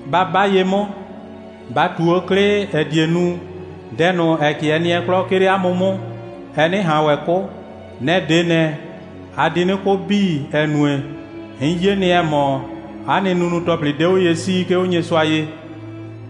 Ba 'ba ye 'mʋ, ba ꞊tu 'o 'klɩ, ‑ɛ die nu, dɛ ꞊nʋ, ‑ɛ 'kɩɛ nɩɛ 'klɔ, 'ke 'le 'a mʋ 'mʋ, ɛ 'nɩ ꞊han ‑wɛ 'kʋ. Nɛ‑ 'de ꞊nɛ, a di 'nɩ 'kʋ 'bii, ‑ɛ nue, 'n 'ye nɩ, ‑ɛ mɔ, 'a nɩ nunu‑tɔplɩ 'de 'o ye 'sii, 'ke 'o Nyɩsʋa ye.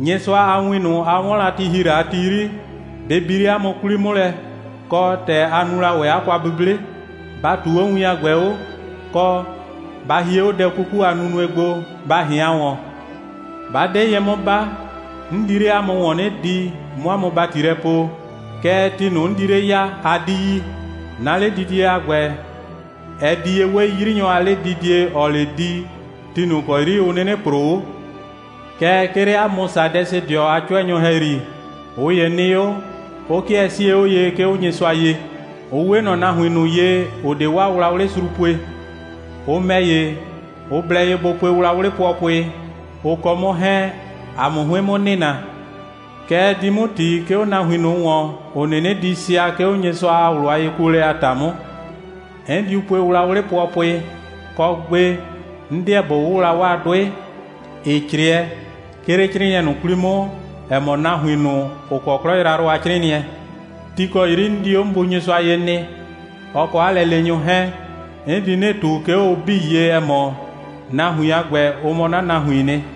Nyɩsʋa a win ꞊nʋ, a 'wɔn la, ti ‑hi la a ti 'yri, bɩ bi 'le 'a mʋ 'kwli 'mʋ lɛ, kɔ, ‑tɛ a nu la ‑wɛ 'a kwa'buble. Ba ꞊tuu 'o win a ‑gbɛ 'o, kɔ, ba hie 'o dɛ 'kuku a nunue gbo, ba ꞊hɩan ‑wɔn. 'Bɩa 'ba 'de ye 'mʋ 'ba, 'n di 'le 'a mʋ ‑wɔn 'nɩ di, 'mʋ 'a mʋ ‑bati lɛ poo. Kɛɛ, ti ꞊nʋ, 'n di 'le ya, a 'di yi. 'Na 'ledidie a ‑gbɛ, ɛ di ye 'we 'yrinyɔ a 'ledidie, ‑ɔɔ 'le di, ti ꞊nʋ ‑kɔ 'yri ʋ 'nɩnɩ ‑proo 'o. Kɛɛ, 'ke 'le 'a mʋ Sadɛsɩdɩɔ a 'cʋɛnyʋ ‑hɛyri, ꞊ʋ ‑ye nɩ 'o, 'ʋ 'kɩɛ 'sie 'o ye, 'ke 'o Nyɩsʋa ye. Ʋ 'we ꞊nɔ nahuin ꞊nʋ ye, ‑ʋ 'de 'waa wlawlɩ sru pue. Ʋ ‑mɛ ‑ye, ʋ blɛ ye bʋ pue wlawlɩ pʋɔpʋɩ, ʋ kɔ 'mʋ 'hɛɛn, ‑a 'mʋ 'hʋɩn 'mʋ nɩnaa. Kɛ ɛ di 'mʋ ‑ti, 'ke 'o nahuin ꞊nʋ ‑wɔn, ‑ʋ 'nɩnɩ di sɩa, 'ke 'o Nyɩsʋa a ꞊wlʋ a yekuolɛ a ‑ta 'mʋ. 'N diu pue wlawlɩ pʋɔpʋɩ, kɔ, gbe, 'n 'deɛ ꞊bo 'wʋwla 'waa 'dʋɩ, ‑ɩ 'crɩɛ, 'ke 'le 'crɩɩnɩɛ ꞊nʋ 'kwli 'mʋ, ‑ɛ mɔ nahuin ꞊nʋ, ‑ʋ kɔ 'klɔ yrayrʋ a 'crɩɩnɩɛ. Ti ‑kɔ 'yri 'n di 'o 'n Bu Nyɩsʋa ye nɩ, ɔ kɔ 'a lɛleenyʋ 'hɛɛn, 'n di 'nɩ ꞊tu, 'ke 'o ʋ 'bii ye, ‑ɛ mɔ, nahuin a ‑gbɛ, ʋ mɔ 'na nahuiin nɩ.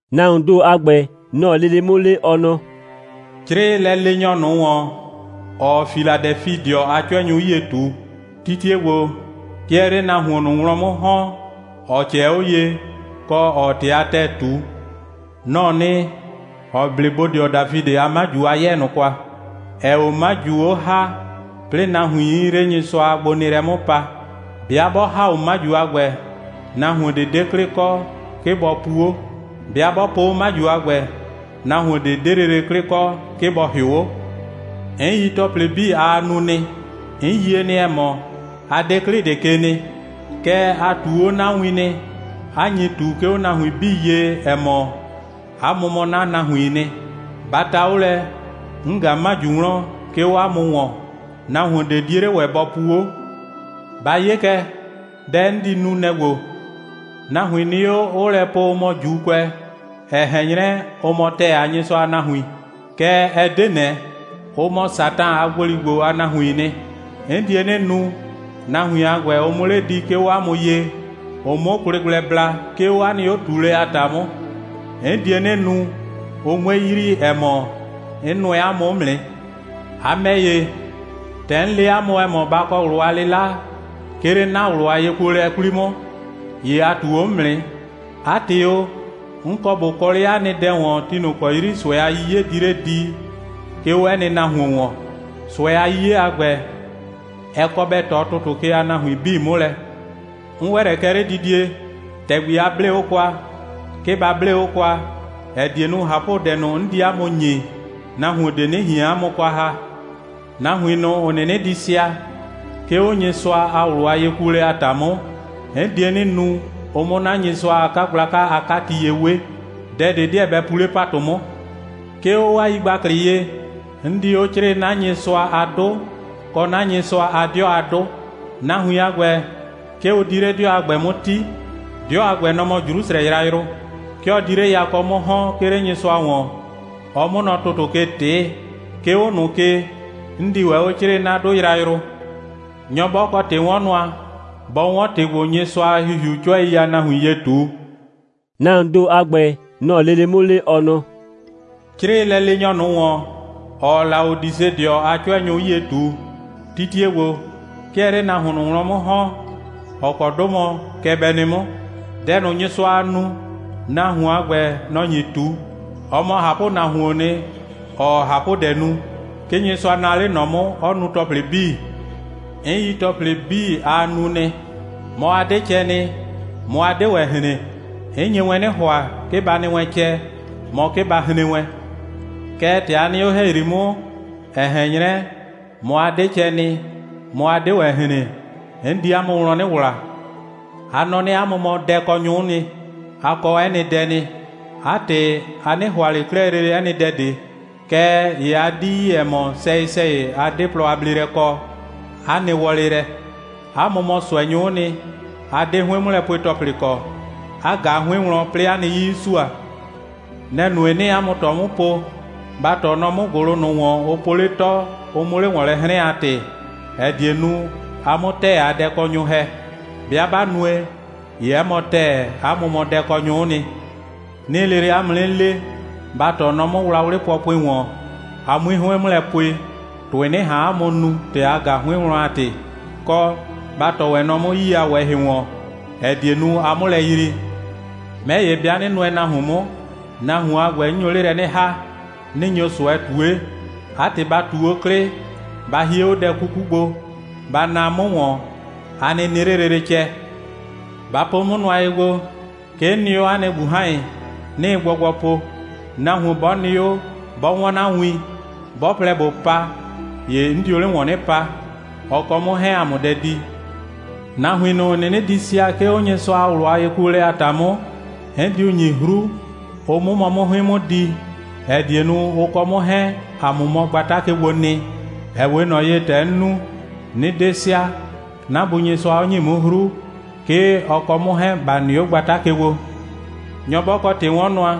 (Nahuoon ‑do a ‑gbɛ, nɔ‑ɔ lele 'mʋ le, ɔ nɔ:) «'Crɩɩ lɛleenyɔ ꞊nʋ ‑wɔn, ‑ɔɔ Filadɛfidɩɔ a 'cʋɛnyʋ 'yie ꞊tu: titie ‑gbo, 'ke ɛɛ 'le nahuon ꞊nʋ wlɔn 'mʋ ‑hɔn, ‑ɔ ꞊cɛɛ 'o ye, kɔ, ‑ɔɔ ‑tɩ a ‑tɛɛ ꞊tu. Nɔ‑ɔ nɩ, ‑ɔ 'ble bodɩɔ Dafidɩ a 'maju a 'yɛɛ ꞊nʋ kwa, ‑ɛɛ 'o 'maju 'o ‑ha, 'plɩɩ nahuiin 'le Nyɩsʋa a gbonɩɩlɛ 'mʋ pa. 'Bɩa 'bɔ ‑ha 'o 'maju a ‑gbɛ, nahuon ꞊de 'de 'klɩ kɔ, 'ke ‑bɔ pu 'o. 'Bɩa 'bɔ po 'o 'maju a ‑gbɛ, nahuon ꞊de 'de lele 'klɩ kɔ, 'ke ‑bɔ ‑hɩʋ 'o. 'N yi ‑tɔplɩ 'bii, aa nu nɩ. 'N yie nɩ, ‑ɛ mɔ, a 'de 'klɩ ꞊de ke nɩ. Kɛɛ, a ꞊tuu 'o 'na win nɩ, 'a nyi ꞊tu, 'ke 'o nahuin 'bii ye, ‑ɛ mɔ, 'a mʋ mɔ 'na nahuiin nɩ. Ba ta 'o lɛ, 'n ꞊ga 'maju wlɔn, 'ke 'o 'a mʋ ‑wɔn. Nahuon ꞊de 'die 'le ‑wɛ bɔ pu 'o. Ba 'ye kɛ dɛ, 'n di nu, nɛ‑ ‑gbo: Nahuin nɩ 'o, 'ʋʋ lɛ po, ʋ mɔ ‑Juukʋɛ, ‑ɛ ꞊hɛn 'nyrɛ, ʋ mɔ ‑tɛɛ a Nyɩsʋa a nahuin. Kɛɛ, ɛ 'de ꞊nɛ. Ʋ mɔ Satan a ‑gboligbo a nahuiin nɩ. 'N die 'nɩ nu, nahuin a ‑gbɛ, ʋ 'mʋ 'le di, 'ke 'o 'a mʋ ye, ʋ 'mʋ kwlɩ gblɛ bla, 'ke 'o 'a nɩ 'o꞊tuulɛ a ‑ta 'mʋ. 'N die 'nɩ nu, ʋ 'mue yrii, ‑ɛ mɔ, 'n nʋɛ 'a mʋ 'mʋ nɩ. A ‑mɛ ‑ye, ‑tɛ 'n le la 'a mʋ, ‑ɛ mɔ, ba kɔ ꞊wlʋ a 'lɩla, 'ke 'le 'na ꞊wlʋ a yekuolɛ 'kwli 'mʋ, ‑ye a ꞊tuu 'o 'mʋ nɩ. 'A ‑tɩ o, 'n kɔ ꞊bo kɔ 'le 'a nɩ dɛ ‑wɔn, ti ꞊nʋ ‑kɔ 'yri ꞊sʋɛ a 'yiye di 'le di, 'ke 'o 'ɛ nɩ nahuon ‑wɔn. ꞊Sʋɛ a 'yiye a ‑gbɛ, ɛ kɔ bɛ ꞊tɔ ‑tʋtʋ ke a nahuin 'bii 'mʋ lɛ. 'N ‑wɛ lɛ kɛ 'ledidie. ‑Tɛgbi, a 'blee 'o kwa, 'ke ba 'blee 'o kwa, ‑ɛ die nu, ꞊hapʋdɛ ꞊nʋ, 'n di 'a mʋ ‑nyi, nahuon ꞊de 'nɩ ꞊hien 'a mʋ kwa ‑ha. Nahuin ꞊nʋ, ‑ʋ 'nɩnɩ di sɩa, 'ke 'o Nyɩsʋa a ꞊wlʋ a yekuolɛ a ‑ta 'mʋ, 'n die 'nɩ nu, ʋ 'mʋ 'na Nyɩsʋa a 'kagblaka a 'kati ye 'we. Dɛ ꞊de 'dɩɛ bɛ pu 'le ‑patʋ 'mʋ. 'Ke 'o 'waa yigbaklɩ ye, 'n di 'o 'crɩɩ 'na Nyɩsʋa a 'dʋ, kɔ 'na Nyɩsʋa a 'dɩɔ a 'dʋ. Nahuin a ‑gbɛ, 'ke ʋ di 'le 'dɩɔ a ‑gbɛ 'mʋ 'ti. 'Dɩɔ a ‑gbɛ, nɔ‑ mɔ Jrusrɛ yrayrʋ. 'Ke ɔ di 'le yakɔ 'mʋ ‑hɔn, 'ke 'le Nyɩsʋa ‑wɔn, ɔ 'mʋ nɔ ‑tʋtʋ ke ꞊tɩɩ. 'Ke 'o ꞊nʋ ke, 'n di ‑wɛ 'o 'crɩɩ 'na 'dʋ yrayrʋ. Nyɔ 'bɔ kɔ ‑tɩ'wɔnnʋa, bɔ 'wɔn ‑tɩ ‑gbo, Nyɩsʋa a ‑Hihiuu 'cʋɛi a nahuin ye ꞊tu.» (Nahuoon ‑do a ‑gbɛ, nɔ‑ɔ lele 'mʋ le, ɔ nɔ:) «'Crɩɩ lɛleenyɔ ꞊nʋ ‑wɔn, ‑ɔɔ Laodisedɩɔ a 'cʋɛnyʋ 'yie ꞊tu: Titie ‑gbo, 'ke ɛɛ 'le nahuon ꞊nʋ wlɔn 'mʋ ‑hɔn, ‑ɔ kɔ 'dʋ mɔ: kɛ bɛ nɩ 'mʋ. Dɛ ꞊nʋ, Nyɩsʋaa nu, nahuon a ‑gbɛ, nɔ‑ nyi ꞊tu. Ɔ mɔ ꞊hapʋnahuoon nɩ, ‑ɔɔ ꞊hapʋdɛ nu. 'Ke Nyɩsʋa naa 'le ꞊nɔ 'mʋ, 'ɔ nu ‑tɔplɩ 'bii. 'N yi ‑tɔplɩ 'bii, aa nu nɩ. Mɔ, a 'de cɛ nɩ, mɔ, a 'de ‑wɛ hren. 'N nye wɛn 'nɩ ‑hʋa, 'ke ba nɩ wɛn cɛ, mɔ, 'ke ba hren wɛn. Kɛɛ, ‑tɛ a nɩ 'o ‑hɛyri 'mʋ, ‑ɛ ꞊hɛn 'nyrɛ, mɔ, a 'de cɛ nɩ, mɔ, a 'de ‑wɛ hren, 'n di 'a mʋ wlɔn 'nɩ ‑wla. A nɔ 'nɩ, 'a mʋ mɔ dɛkɔnyʋ'ʋ nɩ, a kɔ 'ɛ nɩ dɛ nɩ. 'A ‑tɩ, a 'nɩ ‑hʋa ꞊le 'klɛɛ 'ɛ nɩ dɛ ꞊de. Kɛɛ ‑ye a 'di yi, ‑ɛ mɔ, sɛyɩ‑sɛyɩ a 'de plɔ a bleelɛ kɔ, 'a nɩ wɔlɩ lɛ. 'A mʋ mɔ ꞊sʋɛnyʋ'ʋ nɩ, 'a 'de 'hʋɩn'mʋlɛpue‑tɔplɩ kɔ, 'a ꞊ga 'hʋɩn wlɔn, 'plɩɩ 'a nɩ 'yii 'ɩ sua. Nɛ‑ nue, 'nɩɩ 'a mʋ ꞊tɔ 'mʋ po, ba ‑tɔɔ nɔ 'mʋ ‑gʋlʋ ꞊nʋ ‑wɔn, ʋ po 'le 'tɔ, ʋ 'mʋ 'le ‑wɔn lɛ 'hrɛn a ‑tɩ, ‑ɛ die nu, a 'mʋ ‑tɛɛ a dɛkɔnyʋ ‑hɛ. 'Bɩa 'ba nue, ‑ye 'ɛ mɔ ‑tɛɛ, 'a mʋ mɔ dɛkɔnyʋ'ʋ nɩ. 'Nɩɩ lele 'a mʋ 'nɩ le, ba ‑tɔɔ nɔ 'mʋ wlawlɩ pʋɔpʋɩ ‑wɔn, a 'mui 'hʋɩn 'mʋ lɛ pue, ‑tʋɩ 'nɩ ꞊han 'a mʋ nu, ‑tɛ a ꞊ga 'hʋɩn wlɔn a ‑tɩ, kɔ, ba ‑tɔɔ ‑wɛ nɔ 'mʋ 'yii a ꞊wɛhɩ ‑wɔn, ‑ɛ die nu, a 'mʋ lɛ yrii. 'Mɛ ‑ye, 'bɩa 'nɩ nʋɛ nahuon 'mʋ, nahuon a ‑gbɛ, 'n nyo 'le lɛ 'nɩ ‑ha, 'nɩ nyo ꞊sʋɛ ꞊tue. 'A ‑tɩ, ba ꞊tu 'o 'klɩ, ba hie 'o dɛ 'kuku gbo, ba naa 'mʋ ‑wɔn, a nɩ nɩ 'le lele cɛ. Ba po 'o nʋa gbo, 'ke 'n nɩ 'o 'a nɩ ꞊gbuhan.ye, 'nɩɩ gbɔgbɔ po. Nahuon 'bɔ nɩ 'o, 'bɔ 'wɔn 'na win, 'bɔ plɛ ꞊bo pa, ‑ye 'n dio 'le ‑wɔn 'nɩ pa, ɔ kɔ 'mʋ 'hɛɛn ‑a 'mʋ dɛ di. Nahuin ꞊nʋ, ‑ʋ 'nɩnɩ di sɩa, 'ke 'o Nyɩsʋa a ꞊wlʋ a yekuolɛ a ‑ta 'mʋ, 'n diu ‑nyi 'hru, ʋ 'mʋ mɔ 'mʋ 'hʋɩn 'mʋ di, ‑ɛ die nu, ʋ kɔ 'mʋ 'hɛɛn, ‑a 'mʋ mɔ 'na gbata ke gbo nɩ, ‑ɛ 'we ꞊nɔ ye, ‑tɛ 'n nu, 'nɩ 'de sɩa, 'na Bu Nyɩsʋa 'ɔ ‑nyi 'mʋ 'hru, 'ke ɔ kɔ 'mʋ 'hɛɛn, ‑ba nɩ 'o 'a gbata ke gbo. Nyɔ 'bɔ kɔ ‑tɩ'wɔnnʋa,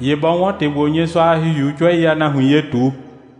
‑ye bɔ 'wɔn ‑tɩ ‑gbo, Nyɩsʋa a ‑Hihiuu 'cʋɛi a nahuin ye ꞊tu.»